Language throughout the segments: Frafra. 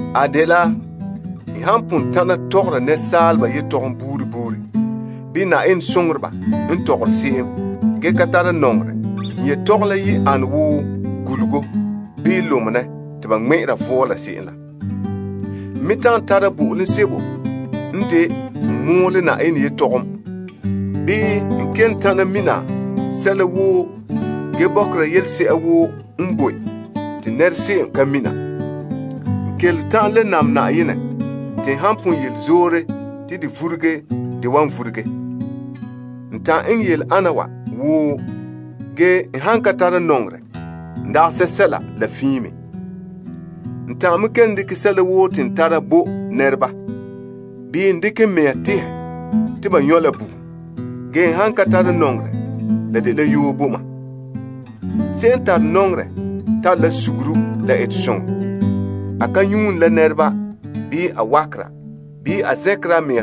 A dela n han pon ta'ana tɔgɔra nɛresaaleba yetɔgom buuri buuri bii nya Na'ayenɛ soŋoreba n tɔgɔre se'em gee ka tara nɔŋerɛ, n yetɔgom la yi ana wo gulugo, bii lumenɛ te ba ŋmɛ'ɛra vɔɔla se'em la. N me ta'an tara bo'olom sebo n de n mɔɔla Na'ayenɛ yetɔgom, bii n kelom ta'an mina sɛla woo gee bɔkera yelese'ere woo n bo te nɛra se'em ka mina. N kelom ta'an le naam Na'ayenɛ zo'e zo'e te n han pon yele zoore te de vuruge de wan vuruge. N ta'an eŋɛ yele ana wa woo, ge n han ka tara nɔŋerɛ, n dagɛ sɛsɛla la fiin me. N ta'an me kelom dekɛ sɛla woo te n tara bo nɛreba, bii n dekɛ n mea tehɛ te ba nyɔ' la bugum. Ge, n han ka tara nɔŋerɛ, la dela yoo bo mam. Se'em n tare nɔŋerɛ tare la suguru la etesoŋɔ. A ka nyuune la nɛreba, bii a wakera, bii a zɛnkera a mea.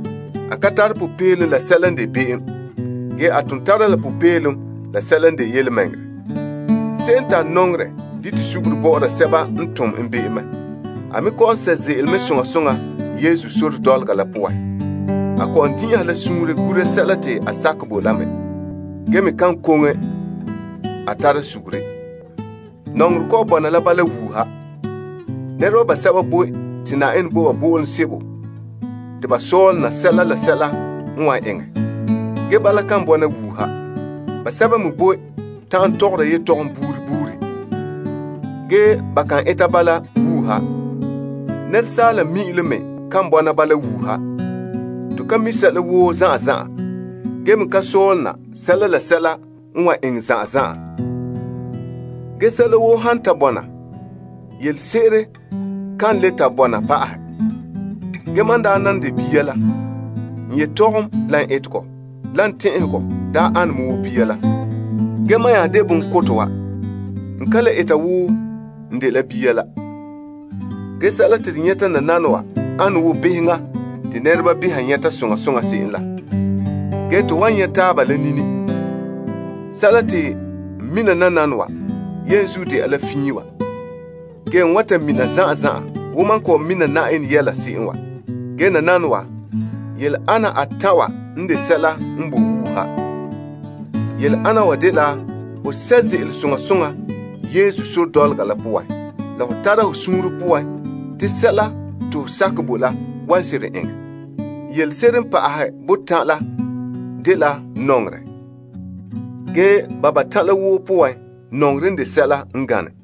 A ka tara popeelom la sɛla n de be'em, ge a ton tara la popeelom la sɛla n de yelemɛŋɛrɛ. Se'em n tare nɔŋerɛ, dite suguru bɔ'ɔra sɛba n tom en be'em mɛ. A me kɔ'ɔn sɛ' ze'ele mɛ soŋa soŋa Yesu sore dɔlɔga la poan. A kɔ'ɔn din'inhe suunre gura sɛla te a sakɛ bo la mɛ, gee me kan koŋe a tara suguru. Nɔŋerɛ kɔ'ɔn bɔna la bala wuuha. Nɛreba basɛba boe te Na'ayenɛ bo ba bo'olom sebo te ba sɔlena sɛla la sɛla n wan eŋɛ. Ge, bala kan bɔna wuuha. Basɛba me boe ta'an tɔgɔra yetɔgom buuri buuri, ge ba kan eta bala wuuha. Nɛresaala mi'ilom me kan bɔna bala wuuha. To ka mi' sɛla woo zan'an zan'an, gee me ka sɔlena sɛla la sɛla n wan eŋɛ zan'an zan'an. Ge, sɛla woo han ta bɔna, yelese'ere kan le ta bɔna pa'ahɛ. Ge mam daa nan de bia la, n yetɔgom, la n etegɔ, la n tɛn'ɛhegɔ daa ane me wo bia la. Ge, mam n nya de bonkotɛ wa, n ka le eta wo n dela bia la. Ge sɛla te to nyɛta nananawa, ane wo beheŋa te nɛreba beha ka nyɛta soŋa soŋa se'em la. Ge to wan nyɛ' taaba la nini. Sɛla te n mina nananawa, yenzuo de'a la fiin wa. Ge, n wan ta mina zan'an zan'an wo mam kɔ'ɔn mina Na'ayenɛ yɛla se'em wa. Ge nananawa, yele ana atan' wa n de sɛla n boe wuuha. Yele ana wa dela ho sɛ' ze'ele soŋa soŋa Yesu sore dɔlɔga la poan, la ho tara ho suunre poan te sɛla te ho sakɛ bo la wan seren eŋɛ. Yelese'ere n pa'ahɛ botan' la dela nɔŋerɛ. Ge, ba batan' la woo poan, nɔŋerɛ n de sɛla n gane.